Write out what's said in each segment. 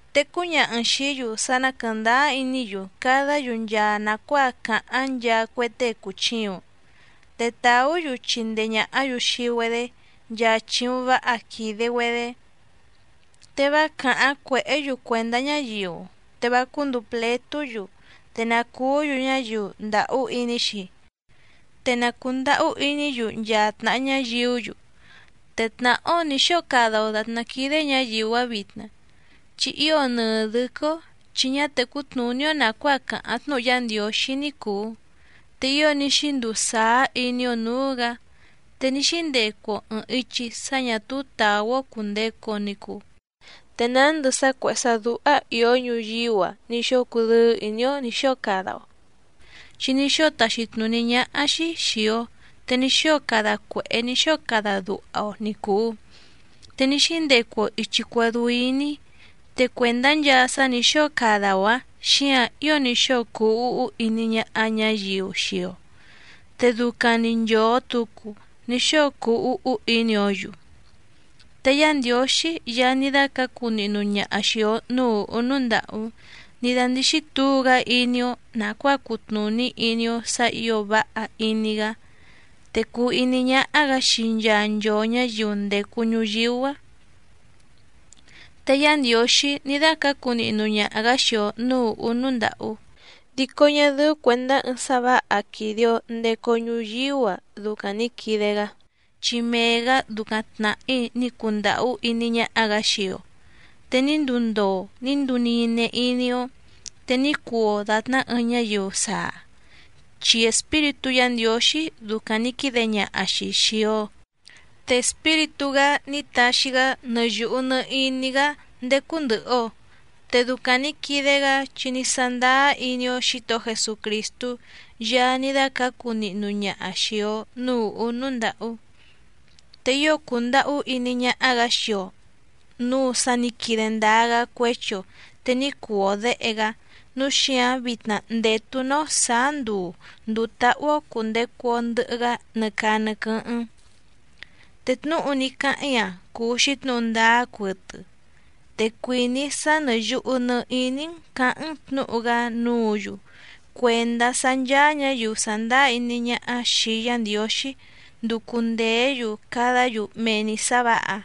Te cúñaha‑n xìí‑yu sá ná quɨ̀ndáá iní‑yu cadá‑yu nchaa nàcuáa càháⁿ nchaa cue tée cùchiuⁿ, te tàú‑yu chindee ñàhá‑yu xii‑güedé nchaa chìuⁿ váha quìde‑güedé. Te vá càháⁿ cuèhé‑yu cuèndá ñáyiu, te vá cúndùu pletú‑yu, te na cùú‑yu ñáyiu ndàhú iní‑xi, te na cùndahú iní‑yu nchaa tnàha ñáyiú‑yu. Te tnàhá‑ó nǐ xóo cada‑o dàtná quídé ñǎyiu‑áⁿ vitna, chi ío nɨɨ dɨ̌quɨ́‑ó chi ñá tècú tnùní‑ó nàcuáa càháⁿ tnúhu Yá Ndiǒxí ní cùu, te ío ní xínduu sàá iní‑ó nǔú‑gǎ, te ní xíndecu‑o ɨ̀ɨⁿ ichi sá ñà túú tàú‑ó cùndecu‑o ni cuu, te nándɨ sá cuèhé sá dúhá ìó ñuyíú‑a ní xóo cudɨ́ɨ́ ìní‑ó nǐ xóo cada‑o chi ní xóo taxi tnùní ñáhá‑xí xìi‑o, te ní xóo cada cuèhé ní xóo cada duha‑o ni cùu, te ní xíndecu‑o ìchi cuedú iní, te cuèndá nchaa sá nǐ xóo cada‑o‑ǎⁿ xíǎⁿ ío ní xóo cuu úhú iní ñáhá ñǎyiu xii‑o, te ducaⁿ‑ni nchòo tucu ní xóo cuu úhú iní‑ǒ‑yu. Te Yá Ndiǒxí Yaá ní dácǎcu nihnu ñaha xìi‑o núú ùhú núú ndàhú ní dándíxí tǔu‑gá iní‑ó nàcuáa cutnùní iní‑ó sǎ ǐo váha iní‑gá, te cùu iní ñáhá‑gǎ xii nchaa nchoo ñǎyiu ndècu ñuyíú‑a. Te Yá Ndiǒxí ní dácǎcu nihnu ñaha‑gǎ xii‑o nǔú ùhú núú ndàhú, dico ñá dɨ́ú cuèndá ɨɨⁿ sá vǎha quìde‑o ndecu‑o ñuyíú‑a ducaⁿ nǐ quide‑gá, chi mee‑gǎ ducaⁿ tnàhí ní cundàhú iní ñáhá‑gǎ xii‑o. Te ní nduu ndoo ní nduu nine iní‑ó, te ní cuu‑o dàtná ɨɨⁿ ñáyiu saa, chi Espíritú Yǎ Ndiǒxí ducaⁿ nǐ quide ñaha‑xi xìi‑o. Te Espíritú‑gá ní taxi‑gá nɨ yùhu nɨ iní‑gá ndécú ndɨ̀hɨ‑o, te ducaⁿ nǐ quide‑gá chi ní sándáá iní‑ó Xǐtohó Jesucrìstú Yaá ní dácǎcu nihnu ñaha xìi‑o núú ùhú núú ndàhú. Te ío cùndahú iní ñáhá‑gǎ xii‑o nǔu sa ní quide ndáá‑gá cuéchi‑o te ní cuu‑o děhe‑gá, núu xíǎⁿ vitna ndètu‑ná‑ó sǎá nduu ndùu táhú‑ó cùndecu‑o ndɨhɨ‑gá nɨ caa nɨ quɨ́hɨ́ⁿ. Te tnúhu ní cáháⁿ‑í‑a cùu‑xi tnúhu ndáá cuɨtɨ, te cuìní‑í sá nɨ̀ yuhu nɨ iní‑n cǎháⁿ‑n tnǔhu‑gá núǔ‑yu cuèndá sá ncháá ñǎyiu sàndáá iní ñáhá xìi Yá Ndiǒxí nducu ndèé‑yu cadá‑yu mee‑ni sǎ vǎha,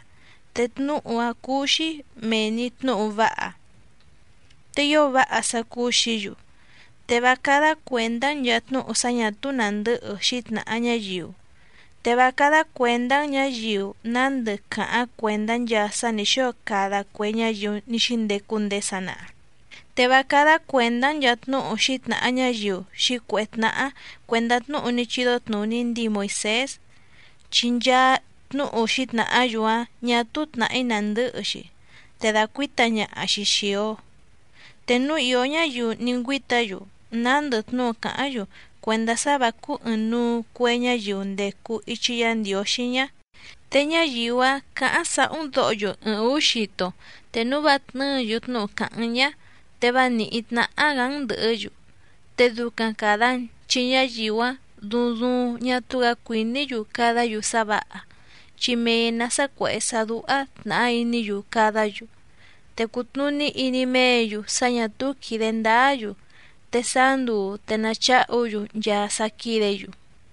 te tnúhu‑áⁿ cúú‑xí mèe‑ni tnúhu váha, te ío váha sá cúú‑xǐ‑yu. Te vá cádá cuèndá‑n nchàa tnúhu sá ñà túú nàndɨ́hɨ xǐtnàha ñáyiu, te vá cádá cuèndá‑n ñǎyiu nándɨ càháⁿ cuèndá nchaa sá nǐ xóo cada cue ñáyiu ní xíndecu ndéé sanaha, te vá cádá cuèndá‑n nchàa tnúhu xǐtnàha ñáyiu xǐcuèhé tnáhá cuèndá tnúhu ní chídó tnùní ndíi Moìsés, chi nchaa tnúhu xǐtnàhá‑yu‑áⁿ ñà túú tnàhí nandɨ́hɨ‑xi, te dàcuíta ñaha‑xi xìi‑o. Te núu ìó ñáyiu ní ngüíta‑yu nándɨ tnúhu càháⁿ‑yu cuèndá sá vǎ cúú ɨ̀ɨⁿnuu cue ñáyiu ndècu ichi Yá Ndiǒxí ñá, te ñáyiu‑áⁿ cǎháⁿ sàhú‑n dǒho‑yu ɨɨⁿ ǔú xito, te núu vá tnɨ́ɨ̌‑yu tnúhu càháⁿ‑n ñá, te vá nìhí tnáhá‑gǎ‑n ndɨ̀hɨ́‑yu. Te ducaⁿ càda‑n, chi ñáyiu‑áⁿ duuⁿ duuⁿ ñá túú‑gǎ cuìní‑yu cadá‑yu sá vǎha, chi mee‑nǎ sá cuèhé sá dúhá tnàhá iní‑yu cadá‑yu, te cùtnuní iní méě‑yu sá ñà túú quìde ndáá‑yu, te sáá nduu te nacháhu‑yu nchaa sá quídě‑yu.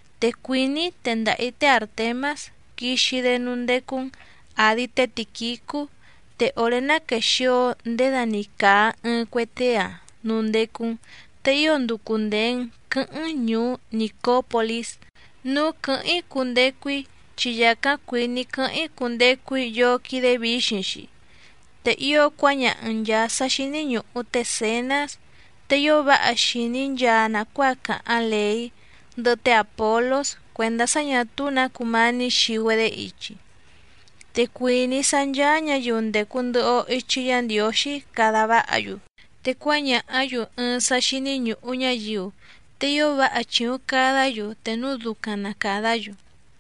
Te cuìní‑í tendaha‑ǐ té Àrtemás quixi‑dé núú ndécú‑n àdi té Tìquicú, te òré ná quèxio ndéda‑ni càa ɨɨⁿ cue tée‑a núú ndécú‑n, te ío nducu ndèe‑n quɨ́hɨ́ⁿ‑n ñùú Nìcópolís núú quɨ̀hɨ́ⁿ‑í cundecu‑í, chi yàcáⁿ cuìní‑í quɨ́hɨ́ⁿ‑í cundecu‑í yóó quídé vǐxiⁿ‑xi. Te ío cuáñaha‑n nchàa sá xíní ñùhu té Zènás tée ío váha xìní nchaa nàcuáa càháⁿ lèí, ndɨhɨ té Àpolós cuèndá sá ñà túú nǎ cumání xii‑güedé ichi. Te cuìní‑í sá ncháá ñǎyiu ndècu ndɨhɨ‑o ichi Yá Ndiǒxí cada váha‑yu, te cuáñàhá‑yu ɨɨⁿ sá xíní ñùhu ñáyiu, te ío váha chìuⁿ cadá‑yu te núu ducaⁿ na càdá‑yu.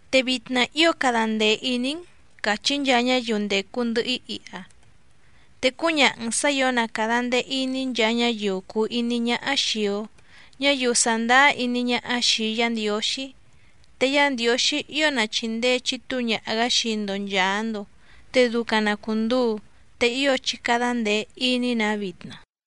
Te vitna ío cada ndee ìní‑n càchí nchaa ñáyiu ndècu ndɨhɨ‑í iha, te cúñaha‑n sǎ ǐo na càda ndee iní nchaa ñáyiu cùu iní ñáhá xìi‑o, ñáyiu sàndáá iní ñáhá xìi Yá Ndiǒxí. Te Yá Ndiǒxí ío na chìndee chitúu ñaha‑gǎ xii‑ndo nchàa‑ndo. Te ducaⁿ na cùnduu. Te ío chí cádá ndèe iní‑nǎ vitna.